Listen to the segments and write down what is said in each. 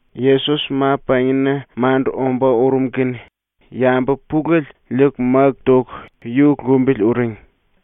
Yesos ma-pangina mandu ombá urum kene yambu pulele liiku máku toku yu lumbili uring.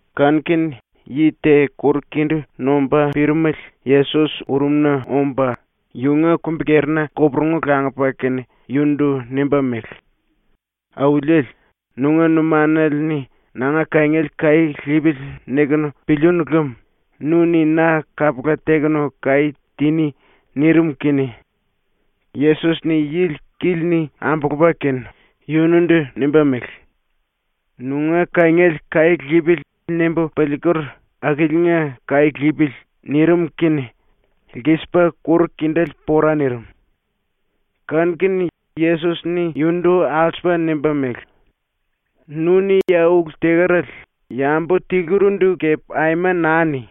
Kanu-kene yi te kuru-kindí nomba pirimele Yesos urumna omba yunga kumbi-kerina koporungu langupa kene yunundu nimba mele: “Auliele, nunga numanale-ni ‘nanga kangiele kaí lipili.’ nikunu pilíínu lem nu-ni na kapula tekunu kaí tiní.” nirim kene Yesos-ni yili kíli-ni ambulupa kene yunundu nimba mele: “‘Nunga kangiele kaí lipili.’ nimbu piliiker akiliinga kaí lipili.” nirim kene lkisipa kuru-kindéle pora nirim. Kanu-kene Yesos-ni yunundu alsupa nimba mele: “Nu-ni ya ulu tekerale yambu tilurindu kepe aima naa ni.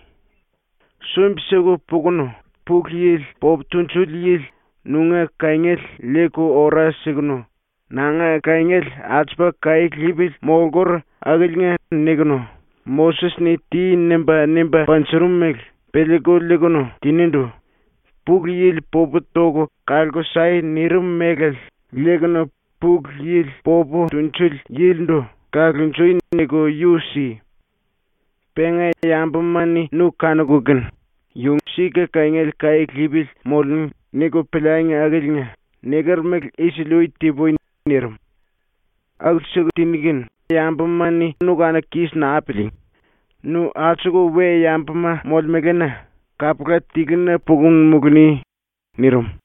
Sumbi-siku pukunu Pulu Yili popu tunjuli yili nunga kangiele liiku ora sikunu, ‘Nanga kangiele alsupa kaí lipili molkur akiliinga.’ nikunu Moses-ni “Ti.” nimba, nimba panjurum mele piliiku liikunu tinindu “Pulu Yili popu toku kalku sai.” nirim mélale liikunu Pulu Yili popu tunjuli yilindu “Kalonjui.” niku yu si. Penga yambuma-ni nu kanuku kene ‘Yu sika kangiele kaí lipili molemú.’ niku piliangi akiliinga niker mele isili-ui ti-pui.” nirim. ⸤“Aku-siku tiní kene yambuma-ni nu kanuku kis naa piliingí, nu alsuku we-yambuma molemelena kapula tiluna pukunu muluni.” nirim.⸥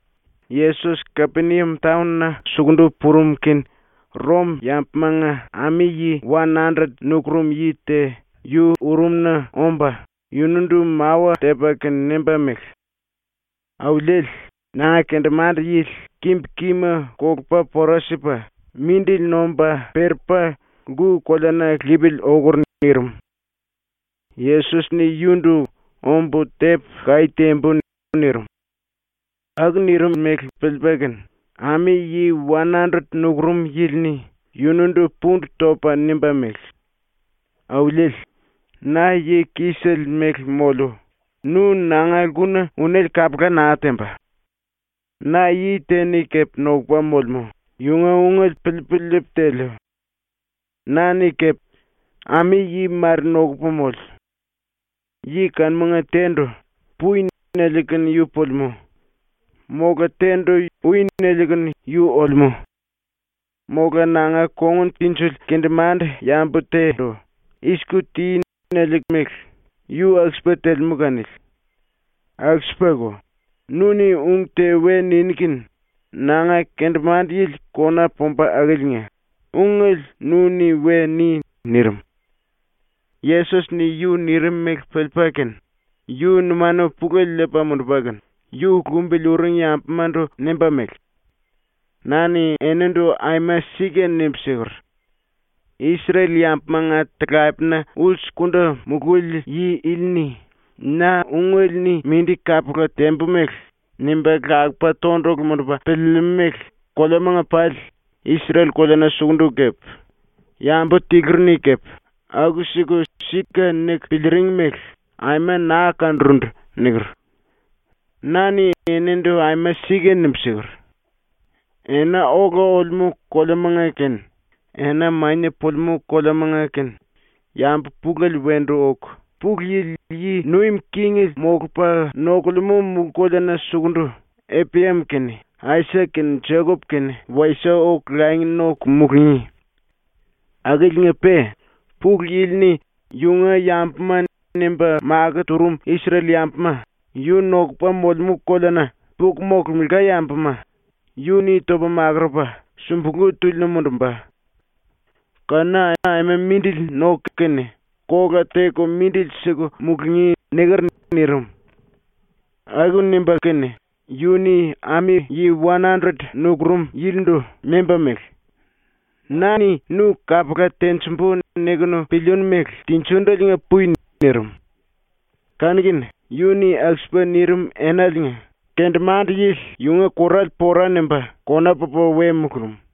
Yesos Kapeniam taon-na sukundu purum kene Rom-yambumanga ami-yi wan-andret nukurum yi te yu urumna omba yunundu mawa tepa kene nimba mele: “Auliele, nanga kendemande-yili kimbu-kima kolupa pora sipa mindili nomba perepa lku-koleana lipili okur.” nirim. Yesos-ni yundu “Ombu tepu kaí timbu.” nirim. ⸤Aku nirim mele piliipa kene⸥ ami-yi wan-andret nukurum yili-ni yunundu pundu topa nimba mele: “Auliele, na yi kisele mele moliu, nu nanga lkuna unéle kapula naa temba. Na yi te-ni kepe nokupa molemú, yunga ungele piliipu liipu teliu. Na-ni kepe ami-yi mare nokupu moliu. Yi kanumanga te-ndu “Pui.” niliu kene yu pulimú. Mola te-ndu “Ui.” niliu kene yu olemú. Mola nanga kongun tinjili kendemande-yambu te-ndu “I-siku ti.” niliu mele yu aku-sipa telemú kanili. Aku-sipako, nu-ni ung te we niní kene nanga kendemande-yili kona pumba akiliinga ungele nu-ni we ni.” nirim. Yesos-ni yu nirim mele piliipa kene yu numanu pulele liipa mundupa kene yu lumbili uring yambumandu nimba mele: “Na-ni enindu aima sika nimbu siker: “Isrel-yambumanga talapena ulsukundu mululi yi ili-ni na ungele-ni mindi kapula tembu mele nimba lakupa tondulu mundupa piliilimú mele koleamanga pali, Isrel-koleana sukundu kepe, yambu tiluri-ni kepe aku-siku ‘Sika’ niku piliiring mele aima naa kanurundu.” niker. Na-ni enindu aima sika nimbu siker: “Ena ola olemú koleamanga kene ena mania pulimú koleamanga kene yambu pulele wendu oku Pulu Yili yi nuim kingele molupa nokulemú mulú-koleana sukundu Eprayam kene Aisak kene Jekop kene wasie oku langi noku mulungí. Akiliinga-pe Pulu Yili-ni ‘yunga yambuma’ nimba makó turum ⸤Isrel-⸥yambuma yu nokupa molemú koleana puku molkemela yambuma yu-ni topa makurupa sumbulú túlina mundumba. Kanuna aima mindili noku kene kola teku mindili siku mulungí.” niker.” nirim. Aku nimba kene yu-ni ami-yi wan-andret nukurum yilindu nimba mele: “Na-ni nu ‘kapula tenjimbu’ nikunu pilíínu mele tinjindeliinga pui.” nirim. Kanu-kene yu-ni aku-sipa nirim enaliinga kendemande-yili yunga kurale pora nimba kona pupa we mulurum.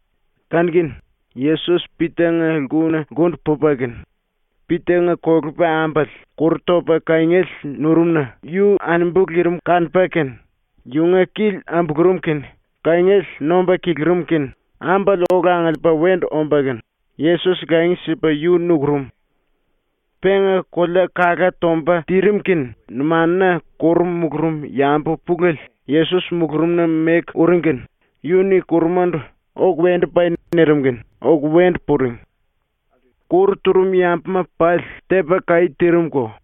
⸤Kanu-kene⸥ Yesos Pita-nga lkuna lkundu pupa kene Pita-nga kolepa-ambale kuru topa kangiele nurum-na yu anambu lirim kanupa kene, yunga kili ambulurum kene kangiele nomba kilirim kene ambale ola angiliipa wendu omba kene Yesos langi sipa yu nukurum. Penga kolea kalá tomba tirim kene numanuna kuru mulurum yambu pulele Yesos mulurumna meku uring kene yu-ni kurumandu “Oku wendu pai.” nirim kene oku wendu puring. Kuru turum yambuma pali tepa kaí tirim-ko.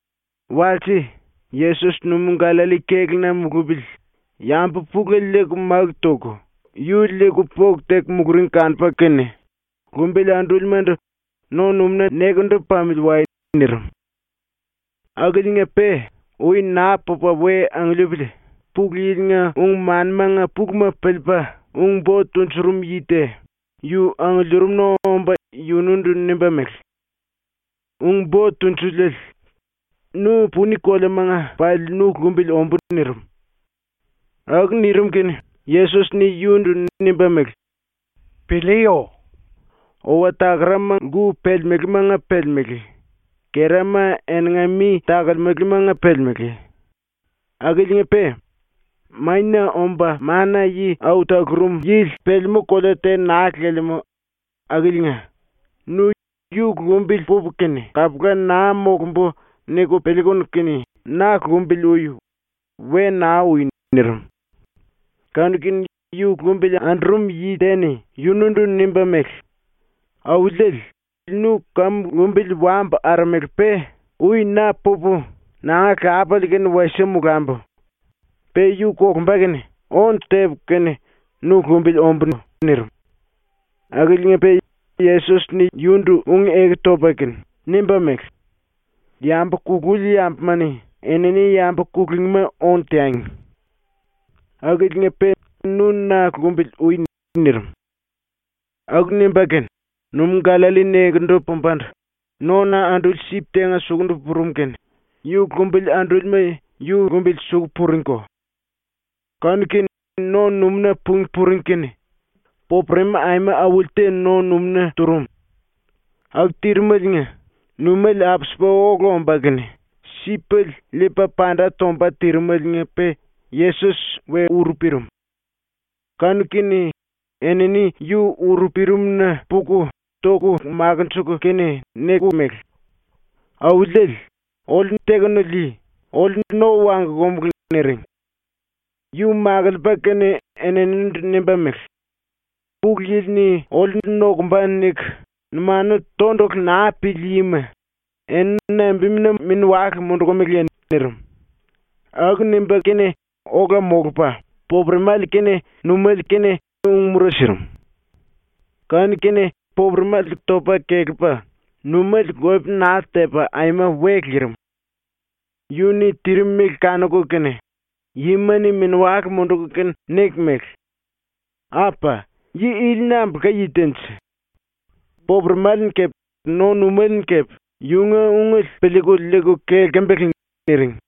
⸤Walse⸥ Yesos ⸤numú-Gallalli kéluna mulupili⸥ yambu pulele liiku máku toku yu liiku póku teku muluring kanupa kene, ⸤lumbili andúlimandu⸥ “No-numúna nekendu pamili wai.” nirim. ⸤Akiliinga-pe ui naa pupa we angiliipili⸥ Pulu Yili-nga ung-manimanga puluma piliipa ung-bo tunjurum yi te yu angiliirimna omba yunundu nimba mele: “Ung-Bo Tunjuliele, nu puni koleamanga pali nu lumbili ombú.” nirim. ⸤Aku nirim kene⸥ Yesos-ni yundu nimba mele: “Piliiyo! Owa-takarama lku pelemelémanga pelemelé; kerama eninga mi takolemelemanga pelemelé, akiliinga-pe Mania Omba Mana-Yi Au Talurum Yili pelemú kolea te naa lelemú ⸤akiliinga, nu ‘Yu lumbili pupu kene kapula naa molumbu.’ niku piliikunu kene na lumbili ui. We naa ui.⸥” nirim. Kanu-kene yu lumbili andurum yi te-ni yunundu nimba mele: “Auliele, nu kamu lumbili wambu aramele-pe ui na pupu nanga lapale ⸤kene wasie molambu. Pe yu kolumba kene⸥ ónu tepu kene nu lumbili ombú.” nirim. Akiliinga-pe Yesos-ni yundu ⸤ung-eku topa kene⸥ nimba mele: “Yambu kululi yambuma-ni enini yambu kulungíma ónu teangi. Akiliinga-pe nu na lumbili ui.” nirim. Aku nimba kene ⸤numú-Gallalli nekendu pumbandu⸥ nona anduli sip tenga suku purum kene yu lumbili andúlima yu lumbili suku puringko. Kanu-kene ⸤no-numúna pungí puring kene⸥ popuremi aima auli te no-numúna turum. Aku tirimeliinga numéle apsipa ola omba kene sipele liipa panda tomba tirimeliinga-pe Yesos we uru pirim. Kanu-kene enini yu uru pirimna puku toku makinjiku kene niku mele: “Auliele, oliu tekunu lii. Oliu no wangkumulu.” niring. Yu ⸤makiliipa kene⸥ eninindu nimba mele: “‘Pulu Yili-ni oliu nokumba.’ niku numanu tondulu naa pili yima, eni nambimuna mini-wale mundukumiliye?” nirim. Aku nimba kene ola molupa popuremale kene numéle kene ung-mura sirim. Kanu-kene popuremale topa kelepa numéle lope naa tepa aima we lirim. ⸤Yu-ni tirim mele kanuku kene⸥ yima-ni mini-wale munduku kene niku mele: “Apa! Yi ili nambulka yi te-nje? Popuremale-ni kepe no-numéle-ni kepe yunga ungele piliiku liiku kelkembele.” niring.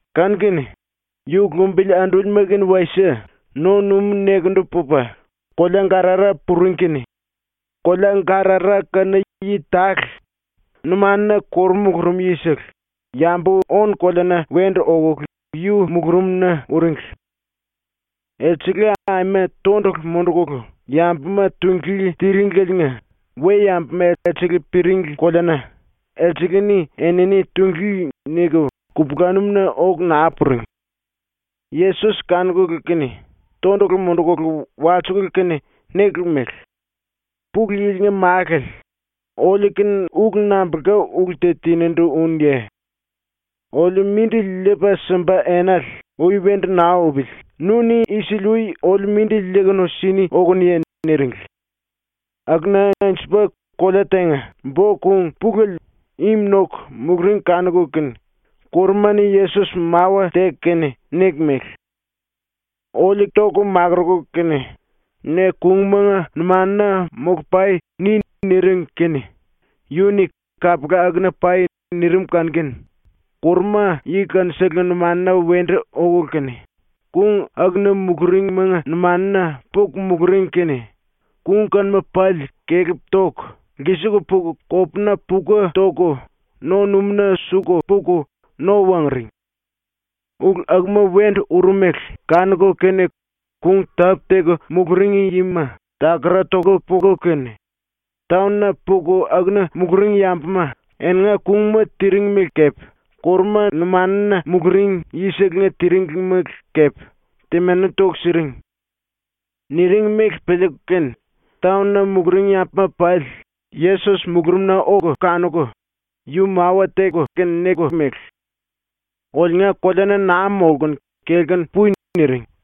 Kanu-kene yu ⸤lumbili andúlima kene wasie⸥ no-numú nekendu pupa kolea-Gadara puring kene kolea Gadara kanuna yi tale, numanuna kuru mulurum yisele, yambu ónu-koleana wendu okulu yu mulurumna uringli. Elsele aima tondulu mundukulu yambuma tunglí tiringleliinga we-yambuma elsele piringli koleana ‘Elsele-ni enini tunglí.’ niku kupulanum-na oku naa puring. Yesos kanukulu kene tondulu mundukulu walsikulu kene nikulu mele: “Pulu Yili-nga Málale, oliu-kene ulu nambulka ulu te tinindu únuye? Oliu mindili liipa simba enale ui wendu naa upili nu-ni isili-ui oliu mindili liiku sini okunuye?” niringli. Akuna anjupa kolea tenga bo-kung pulele im noku muluring ⸤kanuku kene⸥ kuruma-ni Yesos mawa teku kene niku mele: “Oliu toku makuruku kene ‘ne kungmanga numanuna molu-pai.’ ni.” niring kene yu-ni “Kapula, akuna pai.” nirim kanu-kene ⸤kuruma⸥ yi kanuselenga numanuna wendu oku kene kung akuna muluringmanga numanuna puku muluring kene kung kanuma pali kelep toku lkisiku puku kopuna puka toku no-numúna suku puku no wanguring. ⸤Ulu akuma wendu urum mele kanuku kene⸥ kung tápu-teku muluring yima takara toku puku kene, taon-na puku akuna muluring yambuma eninga kungma tiring mele kepe kuruma numanuna muluring yisele tiringli mele kepe temani toku siring. Niring mele piliiku kene taon-na muluring yambuma pali Yesos mulurumna oku kanuku yu mawa teku kene niku mele: “Oliunga koleana naa molkunu kelkunu pui.” niring.